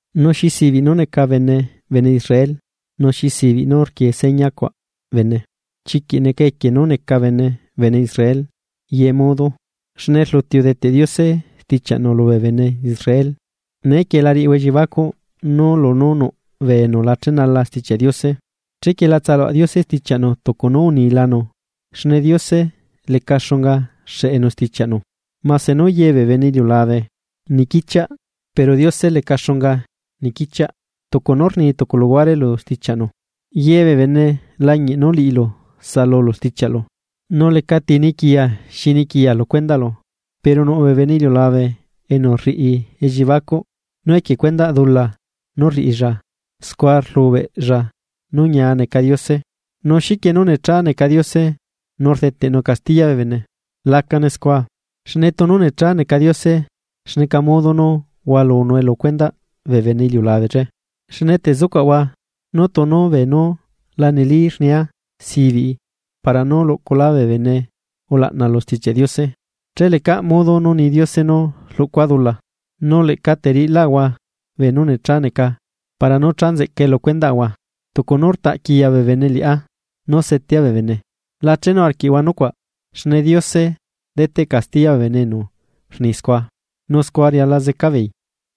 Nu, ¿xi sibiꞌ nú neca bene bene Israel? ¿Nu xi sibiꞌ nú rquie señacuaꞌ bene? Chiquiꞌ neca equie nú neca bene bene Israel ye modo, xne rluti udeteꞌ Diose stichiaꞌnu lubee bene Israel. Neequie la riꞌihua elliebacuꞌ nú lunú nuꞌ bee enu la chenala Stichiaꞌ Diose, chequie la tsaluaꞌ Diose stichiaꞌnu tucu nú unilanu. Xne Diose leca xunga xeꞌenu stichiaꞌnu, mase nú ye bee bene iliulabe nequichiaꞌ pero Diose leca xunga nequichiaꞌ, tucu nú rni tucu luhuare lu stichiaꞌnu: Yebee bene lañiꞌ nú liꞌilu saꞌalulu stichiaꞌlu, nu lecati niquiya xi niquiya lu cuendaꞌlu. Pero nuꞌ bee bene iliulabe enu rriꞌi elliebacuꞌ, nú equie cuendaꞌ dula nú rriꞌilla, scua rlubeꞌlla nú ñia neca Diose, nu ¿xiquie nú necha neca Diose nu rdeteꞌnu castiya bee bene? ¡Lacane scua! Xne tunu necha neca Diose, ¿xneca modo nú hualunue lu cuendaꞌ bee bene iliulabe che? Xne te zucuaꞌahua nú tunu beenú la neli rnia sibiꞌi para nú luꞌculá bee bene ulaꞌna lu Stichiaꞌ Diose, che lecaꞌ modo nú ni Diose nú rluꞌcua dula. Nu leꞌca teriꞌilaꞌahua beenú necha neca para nú cha nzeꞌcae lu cuendaꞌahua, tucu nú rtaꞌ quiya bee bene liꞌá, nú setea bee bene, la chenu arquiaꞌahua nucuaꞌ, xne Diose deteꞌ castiya bee bene enu rni scua, nu scua riala zeca beei.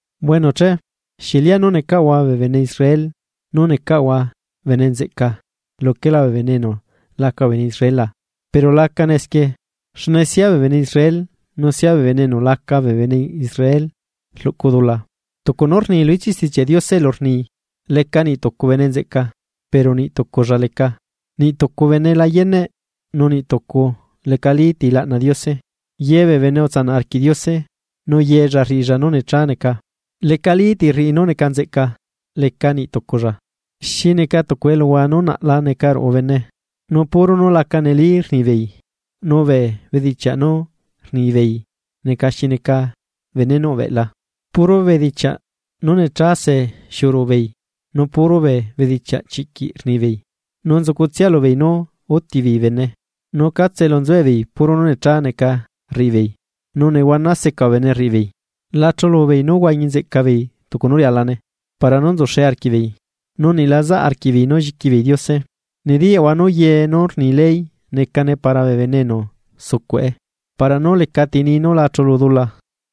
Bueno che, ¿xieꞌ lianú necaꞌahua bee bene Israel nú necaꞌahua bene nzeꞌca luquela bee bene enu laca bene Israel la? ¡Pero la acane esquie! Xne sia bee bene Israel nu sia bee bene enu laca bee bene Israel rluꞌcu dula. Tucu nú rni lu ichiꞌ Stichiaꞌ Diose elu rni: Leca niꞌ tucu bene nzeꞌca, pero niꞌ tuculla leca. Niꞌ tucu bene la yeneꞌ, nu niꞌtucu lecati laꞌna Diose. Yebee bene utsanaꞌ arquiꞌ Diose, nu yella rriꞌilla nú necha neca, lecalí ti rriꞌi nú neca nzeꞌca, leca niꞌ tuculla. Xi neca tucu eluhua nú naꞌla ruꞌu neca bene, nú puro nú laca neli rni bee bene, nu bee bedichiaꞌ nú rni bee bene neca xi neca benenuꞌ beꞌla. Puro bedichiaꞌ nú necha see xiuꞌu ruꞌubeei, nu puro bee bedichiaꞌ chiꞌquiꞌ rnibeei. Nu nzucutsia lubeei nú útibeei bene. Nu catse elu nzuebeei puro nú necha neca rriꞌibeei, nu nehuana seca bee bene rriꞌibeei. La chulubeei nú huañi nzeꞌca beei tucu nú rialane para nú nzuxe arquiꞌbeei. Nu niꞌ la zaꞌ arquiꞌbeei nú lliquibeei Diose. Nediyaꞌahua nú ye nú rni ley necane para bee bene enu sucuꞌe, para nú lecati ni nú la chulu dula,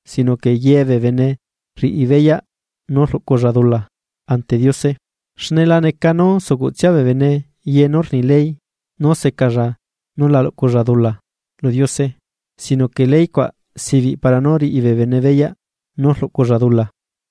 sino que yebee bene riꞌibeyaꞌ nú rluꞌculla dula ante Diose. Xne la neca nú sucuꞌtsia bee bene ye nú rni ley nú secalla nú la luꞌculla dula lu Diose sino que ley cuaꞌ sibiꞌ para nú riꞌi bee bene beyaꞌ nú rluꞌculla dula.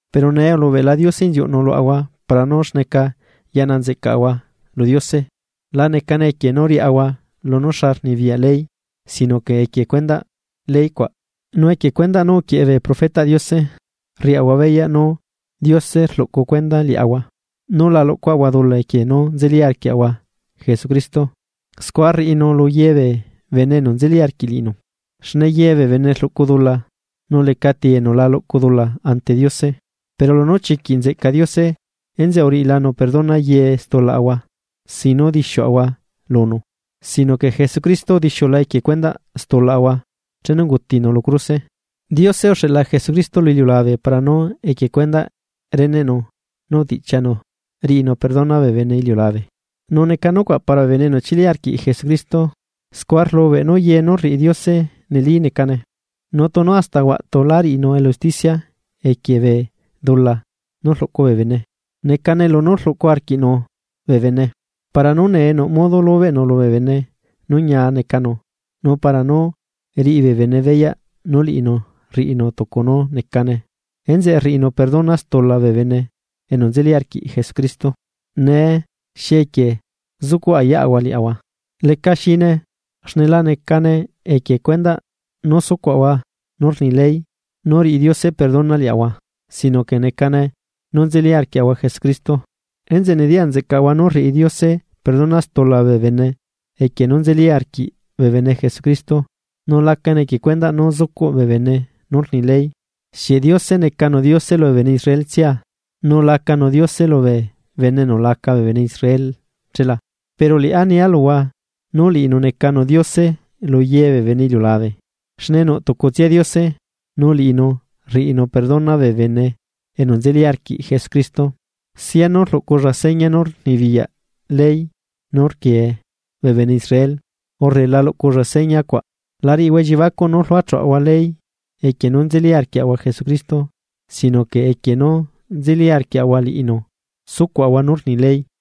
Pero nee ulubeꞌla Diose inziuꞌnu luaꞌahua para nú xneca yaꞌna nzeꞌcaꞌahua lu Diose la necane equie nú riaꞌahua lunú xa rnibiyaꞌ ley sino que equie cuendaꞌ ley cuaꞌ, nu equie cuendaꞌ nú uquieꞌe bee profetaꞌ Diose, rriaꞌahua beyaꞌ nú Diose rluꞌcu cuenda liaꞌahua, nú la luꞌcua'ahua dula equie nú nzeli arquiaꞌahua Jesucristo, scua rriꞌinu luyebee bene enu nzeli arquiꞌ liꞌinu. Xne yebee bene rluꞌcu dula, nu lecati enu la luꞌcu dula ante Diose. Pero lunú chiquiꞌ nzeꞌca Diose, enzeꞌe uriꞌilanu perdona ye stulaꞌahua, sin nú dixiuꞌahua lunu, sino que Jesucristo udixiula equie cuendaꞌ stulaꞌahua chenu ungutinu lu cruse. Diose uxeꞌla Jesucristo lu iliulabe para nú equie cuendaꞌ reneꞌnu nú utiꞌchianu riꞌinu perdona bee bene iliulabe, nu neca nucuaꞌ para bee bene enu chili arquiꞌ Jesucristo, scua rlubeꞌ nú ye nú rriꞌi Diose neli necane. Nu tunu hasta huaꞌtu lá riꞌinu elu usticia equie bee dula nú rluꞌcu bee bene, necane lunú rluꞌcu arquiꞌnu bee bene. Para nú nee nuꞌ modo lubeꞌnu lubee bene nú ñia necanu nu para nú riꞌi bee bene beyaꞌ nú liꞌinu rriꞌinu tucu nú necane enzeꞌe rriꞌinu perdona stula bee bene enu nzeli arquiꞌ Jesucristo. Nee ¿xi equie zucuꞌ ayaꞌahua liaꞌahua? Leca xine, xne la necane equie cuendaꞌ nú sucuaꞌahua nú rni ley nú riꞌi Diose perdona liaꞌahua sino que necane nú nzeli arquiaꞌahua Jesucristo. Enzeꞌe nediyaꞌ nzeꞌcaꞌahua nú rriꞌi Diose perdona stula bee bene equie nú nzeli arquiꞌ bee bene Jesucristo nu lanecane equie cuendaꞌ nú zucuꞌ bee bene nú rni ley. ¿Xieꞌ Diose necanu Diose lubee bene Israel tsia? ¿Nu lacanu Diose lubee bene enu laca bee bene Israel chela? Pero liꞌá nia luhua nú liꞌinu necanu Diose luye bee bene iliulabe. Xne nuꞌ tucutsia Diose, nu liꞌinu rriꞌinu perdona bee bene enu nzeli arquiꞌ Jesucristo, sianu rluꞌculla seña nú rnibiyaꞌ ley nú rquie bee bene Israel, urre la luꞌculla seña cuaꞌ. La riꞌihua elliebacuꞌ nú rluachuꞌahua ley equie nú nzeli arquiaꞌahua Jesucristo sino que equie nú nzeli arquiaꞌahua liꞌinu sucuaꞌahua nú rni ley.